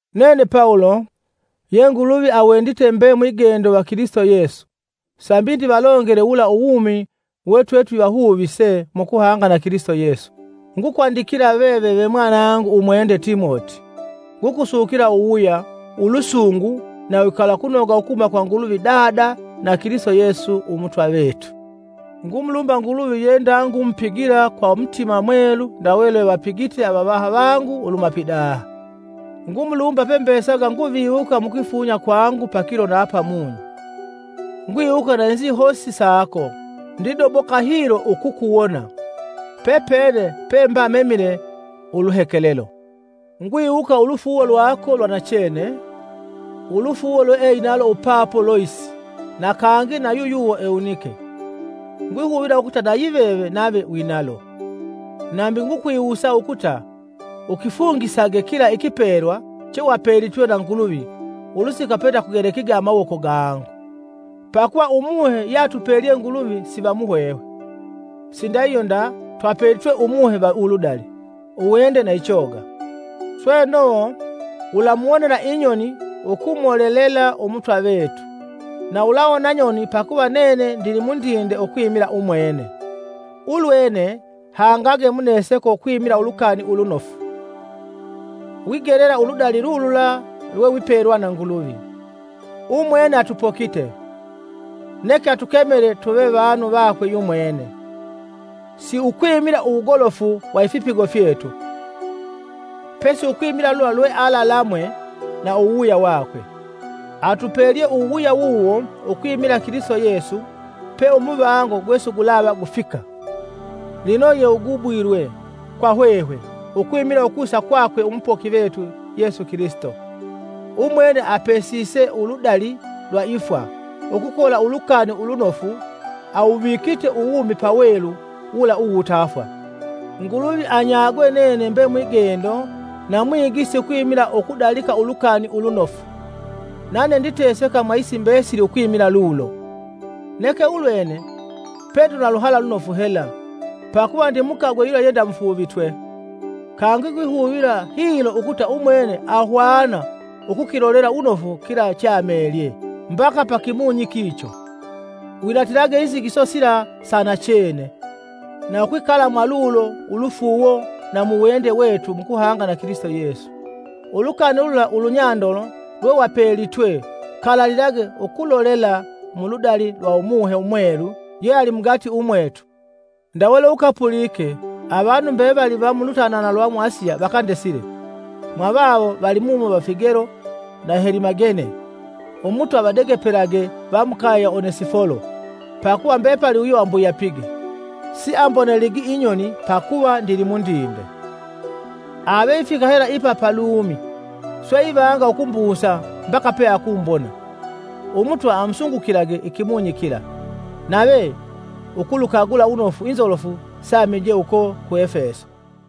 Nene Pawulo, ye Nguluvi awendite mbe mwigendo va Kilisito Yesu sambi ndivalongele wula uwumi we twetwivahuvise mu kuhanga na Kilisito Yesu, ngukwandikila veve ve mwanangu umwende Timoti: Ngukusukila uwuwuya, ulusungu na uwikalakunoga ukuhuma kwa Nguluvi Dada na Kilisito Yesu Umutwa vetu. Ngumulumba Nguluvi ye ndangumupigila kwa mutima mwelu ndawe lwevapigite avavaha vangu uluhuma pidaha, ngumulumba pembesaga nguviwuka mukwifunya kwangu pakilo na pamunyi. Ngwiwuka na inzihosi sako, ndidoboka hilo ukukuwona, pepene pemba memile uluhekelelo. Ngwiwuka ulufuuwo lwako lwa nachene, ulufuuwo lweeinalo upapo Loisi na kangi na yuyuwo Ewunike. Ngwihuvila ukuta na yiveve nave winalo. Nambi ngukwiwusa ukuta ukifungisage kila ikipelwa chewapelitwe na Nguluvi ulusika pendakugelekige amawoko gangu. Pakuva Umuhe yeatupelye Nguluvi siva muhwehwe, sindahihyo nda twapelitwe Umuhe va uludali, uwende na ichoga. Sweno, ulamuwonela inyoni ukumolelela Umutwa vetu, na ulawona nyoni pakuva nene ndili mundinde ukwimila umwene. Ulwene hangage muneseko ukwimila Ulukani Ulunofu, wigelela uludali lulula lwewipelwa na Nguluvi. Umwene atupokite, neke atukemele tuve vanu vakwe yumwene, si ukwimila uwugolofu wa ifipigo fyetu, pesi ukwimila lula lwealalamwe na uwuwuya wakwe. Atupelye uwuwuya wuwo ukwimila Kilisito Yesu pe umuvango gwesigulava gufika, lino yewugubuliwe kwa hwehwe, ukwimila ukusa kwakwe umupoki vetu, Yesu Kilisito, umwene apesise uludali lwa ifwa, ukukola Ulukani Ulunofu awuvikite uwumi pawelu wula uwutafwa. Nguluvi anyagwe nene mbe mwigendo na mwigisi ukwimila ukudalika Ulukani Ulunofu, nane nditeseka mwa isi mbesili ukwimila lulo. Neke ulwene pe ndina luhala lunofu hela pakuva ndimukagwe yula yendamufuuvitwe, kangi ngwihuvila hilo ukuta umwene ahwana ukukilolela wunofu kila cheamelye, mbaka pa kimunyi kicho. Winatilage inzigiso sila sa nachene, na ukwikala mwalulo ulufuuwo na mu wende wetu mukuhanga na Kilisito Yesu. Ulukani lula ulunyandolo lwewapelitwe kalalilage ukulolela muludali lwa Umuhe Umwelu yeali mugati umwetu. Ndawe lweukapulike, avanu mbevali va mulutanana lwa mu Asiya vakandesile, mwavawo valimumo va Figelo na Helimagene. Umutwa avadegepelage va mukaye ya Onesifolo; pakuva mbepali uyo ambuyapige, siamboneligi inyoni pakuva ndilimundinde, ave ifika hela ipa pa Lumi, swe ivanga ukumbusa mbaka peakumbona. Umutwa amusungukilage ikimunyi kila! Nave ukulukagula wunofu inzolofu seamije uko ku Efeso.